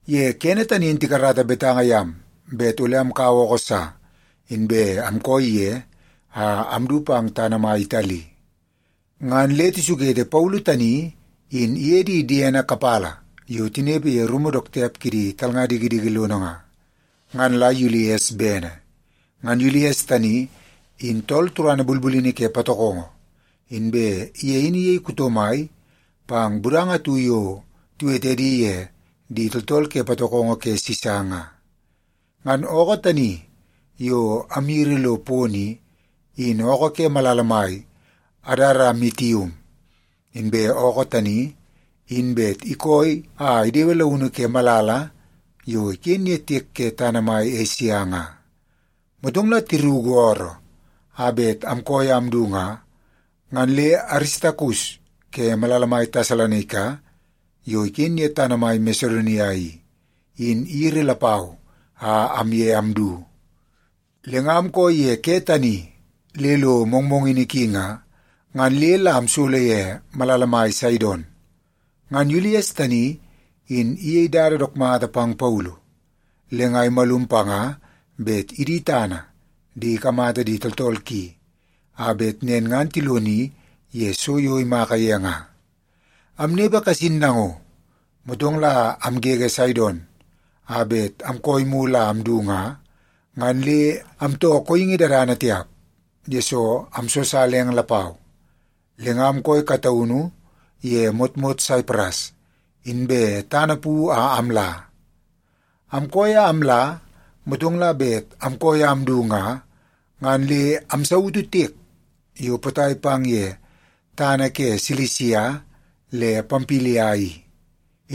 Ye kene tani in tikarata betanga yam bet ole amkaua ookoo sa, inbe amkooi ye a amdu pang tana mai Itali. Ngan le tisukete Paulu tani in iye di diene kapala yo tinepe ye rumu dook tiap kidi talnga dikidiki lono nga, ngan la Yulies bene. Ngan Yulies tani in tool turana bulbulini ke patokongo, inbe ye in iyei kuto mai pang budanga atu yo tiwete edi ye Di Tooltool Ke Patokongo Ke Sisa nga. Ngan ookoo tani yo amyiri lo pono i, in ookoo ke malala mai Adaramitium. Inbe ookoo tani in bet ikooi a idewe launu ke malala yo iken ye tiek ke tana mai Esia nga. Motong la tiruku ooroo a bet amkooi a amdu nga, ngan le Aristakus ke malala mai Tesalonaika yo iken ye tana mai Masedonia i, in iyiri lapau a amye amdu. Le nga amkooi ye ke tani le lo mongmongini ki nga, ngan le la amsolo ye malala mai Saidon. Ngan Yulies tani in iyei dada dook mata pang Paulu, le nga imalum panga bet idi tana di ikamata di tooltool ki, a bet nen ngan tiloni ye so yo imaka ye nga. Amnepe kasin nango, motong la amgege Saidon a bet amkooi mulu a amdu nga, ngan le amtoo kooingi dadana tiap, yesoo amsosala eng lapau. Le nga amkooi kataunu ye motmot Saipras, inbe tana pu a amla. Amkooi a amla, motong la bet amkooi a amdu nga, ngan le amsautu tiek yo potai pang ye tana ke Silisia le Pampilia i,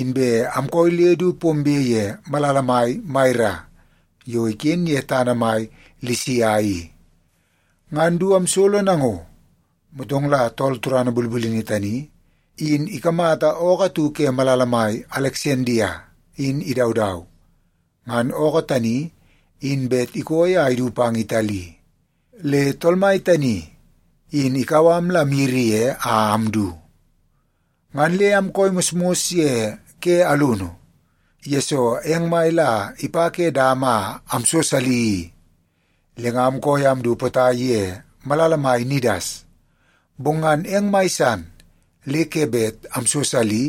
inbe amkooi le du pombe ye malala mai Maira yo iken ye tana mai Lisia i. Ngan du amsolo nango, motong la tool turana bulbulini tani in ikamata ookoo atu ke malala mai Aleksandia in idaudau. Ngan ookoo tani in bet ikooi a idu pang Itali, le tool mai tani in ikau am la amyiri ye a amdu. Ngan le amkooi mosmos ye ke alunu, yesoo eng mai la ipa ke dama a amsosali i. Le nga amkooi a amdu potai ye malala mai Nidas, bong ngan eng mai san le ke bet amsosali,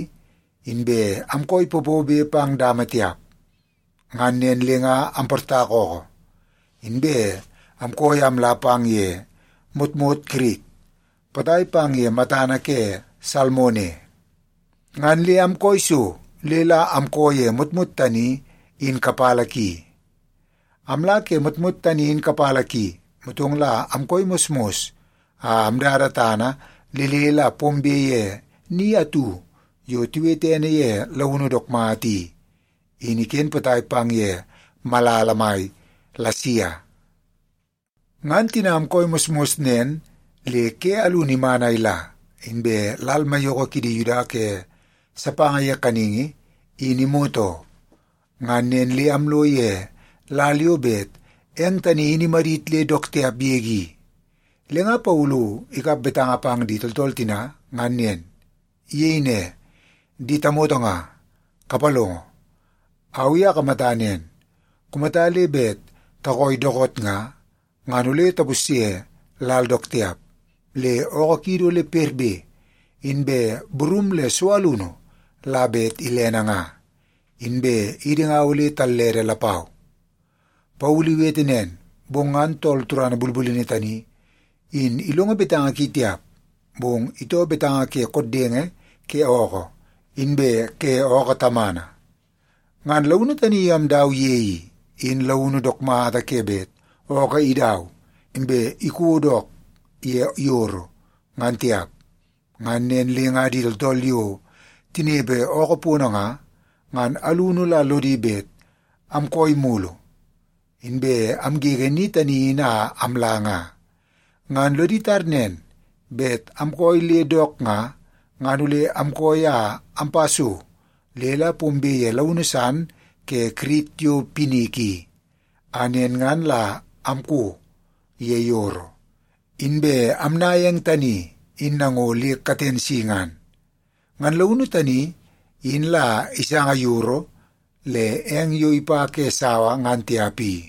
inbe amkooi popobe pang dama tiap. Ngan nen le nga amportaka ookoo, inbe amkooi a amla pang ye motmot Kirit potai pang ye matana ke Salmone. Ngan le amkooi so le la amkoo ye motmot tani in kapala ki. Amla ke motmot tani in kapala ki, motong la amkooi mosmos a amdada tana le le la pombe ye ni atu yo tiwete ene ye Launu Dook Mata i, in iken potai pang ye malala mai Lasia. Ngan tina amkooi mosmos nen le ke alunu iman a ila, inbe lal maiyoko kidi Yuda ke sapanga ye kaningi in imot oo. Ngan nen le amlo ye lal yo bet eng tani in imadit le dook tiap yege i, le nga Paulu ikap betanga pang di tooltool tina ngan nen. Iyei ne, “Di tamoto nga, kapalongo! Au i akamata nen, kumata le bet takooi dookoot nga, ngan ole tapusye lal dook tiap, le ookoo kiidi ole perbe, inbe burum le so alunu la bet ilene nga. Inbe idi nga ole tallede lapau.” Paulu iwete nen, bong ngan tool turana bulbulini tani in ilongo betanga ki tiap. Bong itoo betanga ke koddenge ke ookoo, inbe ke ookoo tamana. Ngan launu tani yo amdau ye i, in launu dook mata ke bet ookoo idau, inbe iko dook ye yoro, ngan tiap. Ngan nen le nga di tooltool yo tinepe ookoo pono nga, ngan alunu la lodi bet amkooi mulu, inbe amgege ni tani in a amla nga. Ngan lodi tar nen, bet amkooi le dook nga, ngan ole amkooi a ampa so le la pombe ye launu san ke Kirit yo Pinik i, a nen ngan la amko ye yoro, inbe amnaia eng tani in nango le katen si ngan. Ngan launu tani in la isanga yoro le eng yo ipa ke sawa ngan tiap i.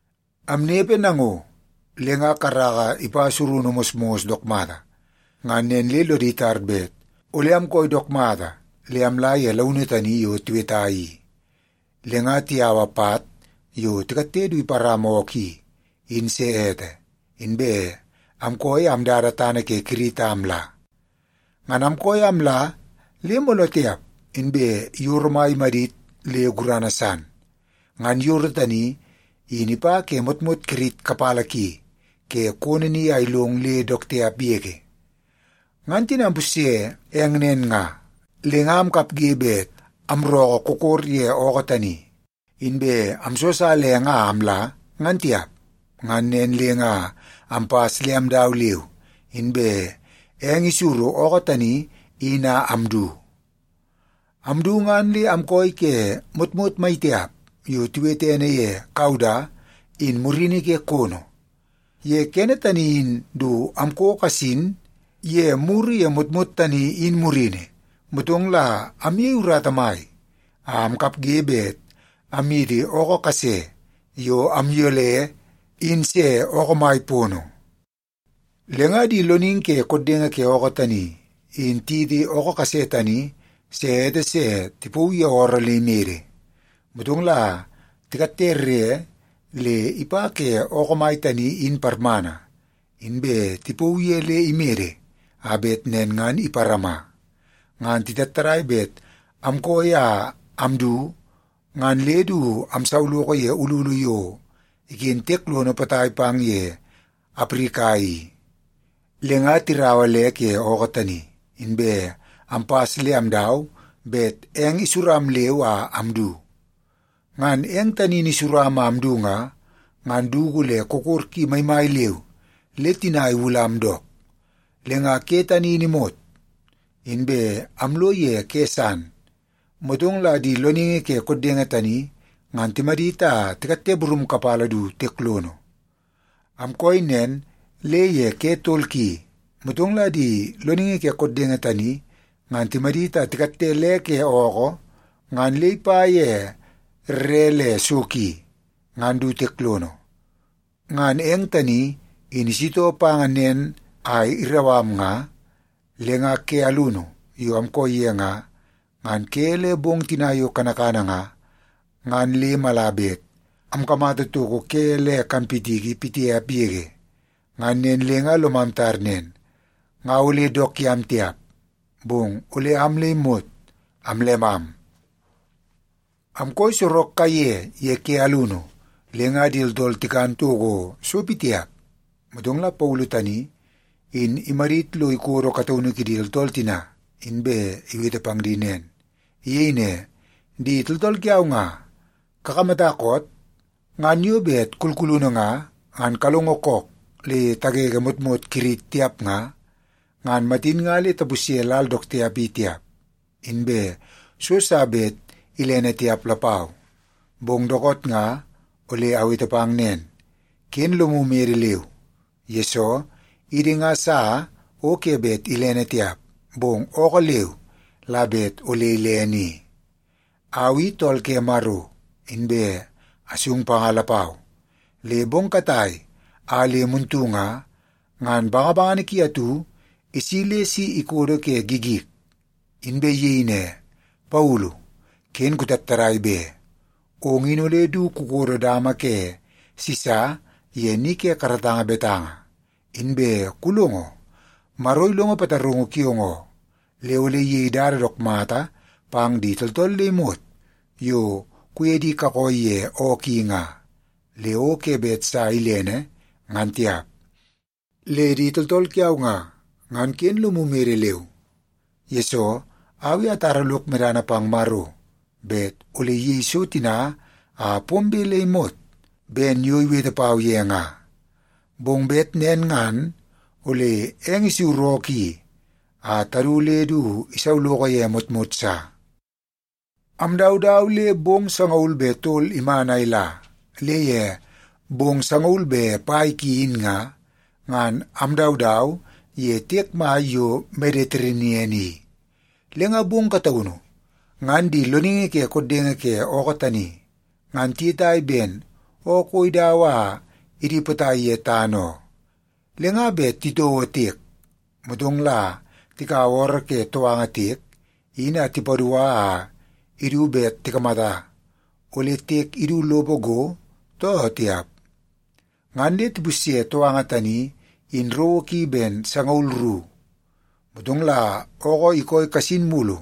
Amnepe nango, le nga karaka ipa surunu mosmos dook mata. Ngan nen le lodi tar bet ole amkooi dook mata le amla ye launu tani yo tiweta i. Le nga tiyaua pat yo tikatte du iparama ookoo i, in se ete, inbe amkooi a amdada tana ke Kirit a amla. Ngan amkooi a amla le mooloo tiap, inbe yoro mai imadit le gurana san. Ngan yoro tani in ipa ke motmot Kirit kapala ki ke kono ni a ilong le dook tiap yege. Ngan tina ampusye eng nen nga, le nga amkapge bet amrookoo kokor ye ookoo tani, inbe amsosala eng a amla, ngan tiap. Ngan nen le nga ampas le amdau leu, inbe eng isuru ookoo tani in a amdu. Amdu ngan le amkooi ke motmot maitiap yo tiwete ene ye Kauda in murini ke kono. Ye kene tani in du amko kasin ye muru ye motmot tani in murini, motong la amyei urata mai a amkapge bet amyiti ookoo kase yo amyole in se ookoo mai pono. Le nga di loningi ke koddenge ke ookoo tani in tiyiti ookoo kase tani se ete se tipauu ye ooroo le imede, motong la tikatte rre le ipa ke ookoo mai tani in parmana, inbe tipauu ye le imede a bet nen ngan iparama. Ngan titattadai bet amkooi a amdu ngan le du amsauloko ye ululu yo iken tiek lono potai pang ye Aprika i, le nga tirau le ke ookoo tani, inbe ampas le amdau bet eng isuram leu a amdu. Ngan eng tani in isuram a amdu nga, ngan dugu le kokor ki maimai leu le tina iwulam dook. Le nga ke tani in imot, inbe amlo ye ke san, motong la di loningi ke koddenge tani ngan timadit a tikatte burum kapala du tiek lono. Amkooi nen le ye ke tol ki, motong la di loningi ke koddenge tani ngan timadit a tikatte le ke ookoo ngan le ipa ye rre le so ki, ngan du tiek lono. Ngan eng tani in isitoo pa nen a irau am nga, le nga ke alunu yo amkooi ye nga, ngan ke le bong tina yo kanakana nga, ngan le mala bet amkamata toko ke le kanpitiki pitiap yege. Ngan nen le nga lomam tar nen, nga ole dook yam tiap, bong ole am le imot amllemam. Amkooi sorok kaiye ye ke alunu, le nga di tooltool tikan toko so pitiap. Motong la Paulu tani in imadit lo ikodo kataunu kidi tooltool tina, inbe iwete pang di nen. Iyei ne, “Di tooltool kiau nga, kakamata koot? Ngan yo bet kulkulunu nga, ngan kalongo kook le tagege motmot Kirit tiap nga, ngan matin nga le tapusye lal dook tiap i tiap, inbe so sa bet ilene tiap lapau. Bong dookoot nga ole awete pang nen, ken lomu mede leu, yesoo idi nga sa o ke bet ilene tiap, bong ookoo leu la bet ole ilene i. Au i tool ke Maro, inbe asung panga lapau. Le bong katai a le muntu nga, ngan bangabangana ki atu isi le si ikodo ke gigik, inbe iyei ne, ‘Paulu, ken kutattadai be! Ong in ole du kukodo dama ke Sisa ye ni ke karatanga betanga. Inbe kulongo, Maro ilongo pataraungu kiong oo, le ole iyei dada dook mata pang di tooltool le imot yo kuye di kakooi ye ookoo i nga, le o ke bet sa ilene, ngan tiap.’ Le di tooltool kiau nga, ngan ken lomu mede leu, yesoo au i atara lok medana pang Maro bet ole iyei so tina a pombe le imot ben yo iwete pau ye nga. Bong bet nen ngan ole eng isuru ookoo i a tadu le du isauloko ye motmot sa.” Amdaudau le bong sangaul be tol iman a ila, le ye bong sangaul be pai ki in nga, ngan amdaudau ye tiek mai yo Mediterenian i. Le nga bong kataunu ngan di loningi ke koddenge ke ookoo tani ngan tiyetai ben ookoo o idau a idi potai ye tana oo. Le nga bet titouo tiek, motong la tikaua ooroo ke touanga tiek in a tipadua a idu bet tikamata ole tiek idu lopo go, too tiap. Ngan le tipusye touanga tani in rowo ki ben sangaul ru. Motong la ookoo ikooi kasin mulu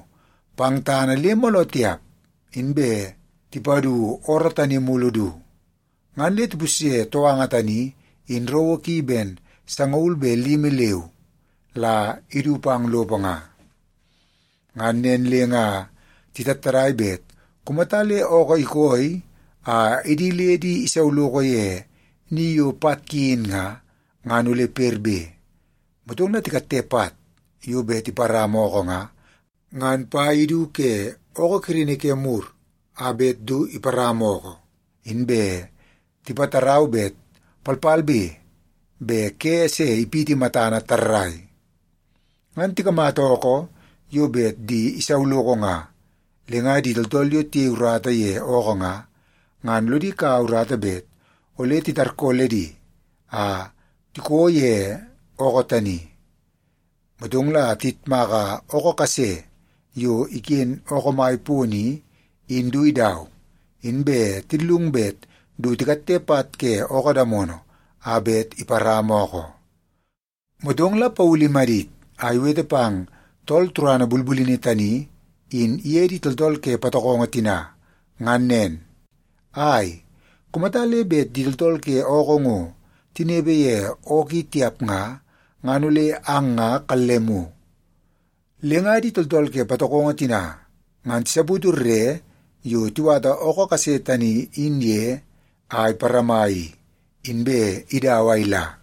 pang tana le mooloo tiap, inbe tipadu ooroo tani mulu du. Ngan le tipusye touanga tani in rowo ki ben sangaul be limi leu la idu pang lopo nga. Ngan nen le nga titattadai bet kumata le ookoo ikooi a idi le di isauloko ye ni yo pat ki in nga, ngan ole perbe. Motong la tikatte pat yo bet iparama ookoo nga, ngan pai idu ke ookoo kirini ke mur a bet du iparama ookoo, inbe tipatarau bet palpalbe be ke se ipiti matana tarrai. Ngan tikamata ookoo yo bet di isauloko nga, le nga di tooltool yo tiyei urata ye ookoo nga, ngan lodi kaua urata bet ole titarkooledi a tikoo ye ookoo tani. Motong la tiyitmaka ookoo kase yo iken ookoo mai pono i, in du idau, inbe tillung bet du tikatte pat ke ookoo damono a bet iparama ookoo. Motong la Paulu imadit a iwete pang tool turana bulbulini tani in iye di tooltool ke patokongo tina ngan nen, “Ai, kumata le bet di tooltool ke ookoo ngo tinepe ye ookoo i tiap nga, ngan ole ang nga kallemu.” Le nga di tooltool ke patokongo tina ngan tisaputu rre yo tiwata ookoo kase tani in ye a iparama i, inbe idau a ila.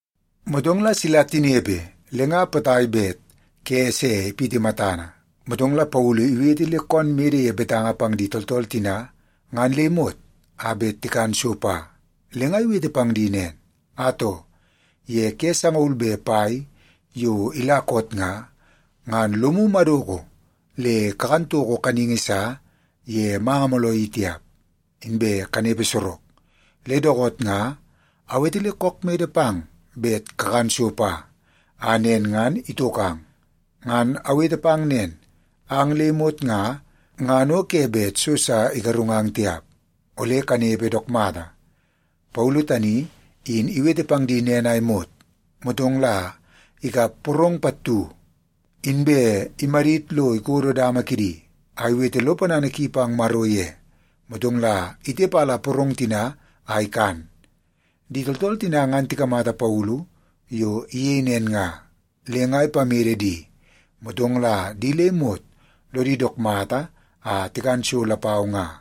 Motong la sila tinepe le nga potai bet ke se ipiti matana, motong Paulu iwete le koon mede ye betanga pang di tooltool tina ngan le imot a bet tikan so pa. Le nga iwete pang di nen, “Atoo, ye ke sangaul be pai yo ila koot nga, ngan lomu madoko le kakan toko kaningi sa ye manga mooloo i tiap, inbe kanepe sorok. Le dookoot nga awete le kook mede pang bet kakan so pa, a nen ngan itokang. Ngan awete pang nen, ang le imot nga, ngan o ke bet so sa igarungang tiap. Ole kanepe dook mata.” Paulu tani in iwete pang di nen a imot, motong la ikap porong pattu, inbe imadit lo ikodo dama kidi, a iwete lo ponana ki pang Maro ye, motong la itepala porong tina a ikan. Di tooltool tina ngan tikamata Paulu yo iyei nen nga, le nga ipamede di, motong la di le imot lodi dook mata a tikan so lapau nga.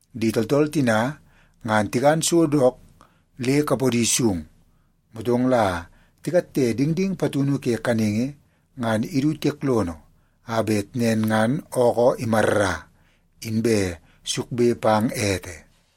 Di tooltool tina ngan tikan so dook le kapodi sung, motong la tikatte dingding patunu ke kaningi, ngan idu tiek lono, a bet nen ngan ookoo imarra, inbe sukbe pang ete.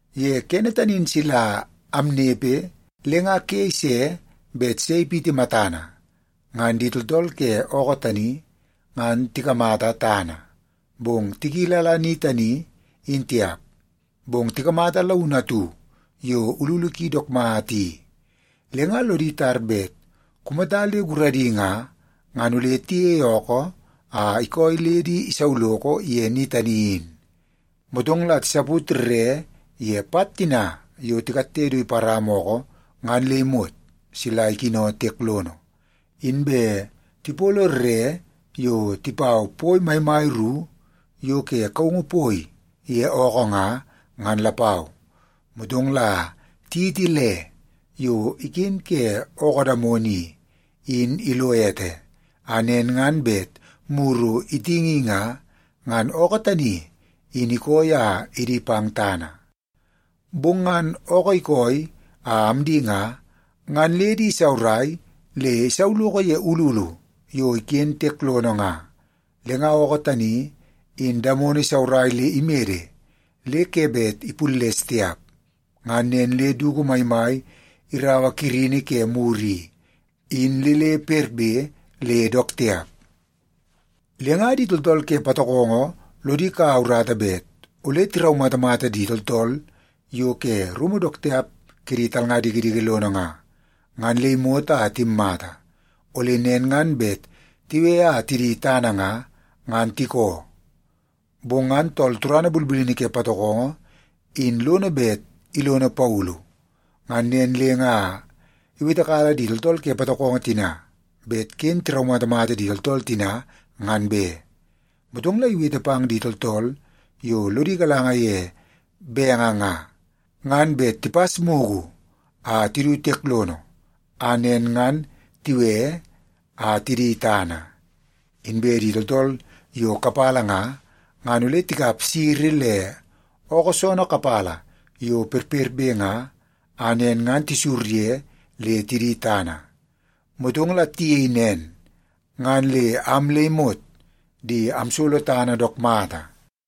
Ye kene tani in sila amnepe le nga ke ise bet se ipiti matana, ngan di tooltool ke ookoo tani ngan tikamata tana, bong tikilala ni tani in tiap. Bong tikamata launu atu yo ululu ki dook mata i. Le nga lodi tar bet kumata le guradi nga, ngan ole tiyeie ookoo a ikooi le di isauloko ye ni tani in. Motong la tisaput rre ye pat tina yo tikatte du iparama ookoo ngan le imot sila ikino tiek lono. Inbe tipolo rre yo tipau poi maimai ru yo ke kaungu poi ye ookoo nga, ngan lapau. Motong la tiyiti le yo iken ke ookoo damono i, in ilo ete, a nen ngan bet muru itingi nga, ngan ookoo tani in ikooi a idi pang tana. Bong ngan ookoo ikooi a amdi nga, ngan le di isaurai le isauloko ye ululu yo iken tiek lono nga. Le nga ookoo tani in damono isaurai le imede le ke bet ipulles tiap. Ngan nen le dugu maimai iraua kirini ke mur i, in le le perperbe le dook tiap. Le nga di tooltool ke patokongo lodi kaua urata bet ole tiraumatamata di tooltool yo ke rumu dook tiap kidi talnga dikidiki lono nga, ngan le imot a timmata. Ole nen ngan bet tiwe a tidi tana nga, ngan tikoo. Bong ngan tool turana bulbulini ke patokongo in lono bet ilono Paulu. Ngan nen le nga iwetekala di tooltool ke patokongo tina bet ken tiraumatamata di tooltool tina ngan be. Motong la iwete pang di tooltool yo lodi galanga ye benge nga, ngan bet tipas mugu a tidu tiek lono, a nen ngan tiwe a tidi tana. Inbe di tooltool yo kapala nga, ngan ole tikap siri le ookoo soonoo kapala yo perperbe nga, a nen ngan tisur ye le tidi tana. Motong la tiyei nen, ngan le am le imot di amsolo tana dook mata.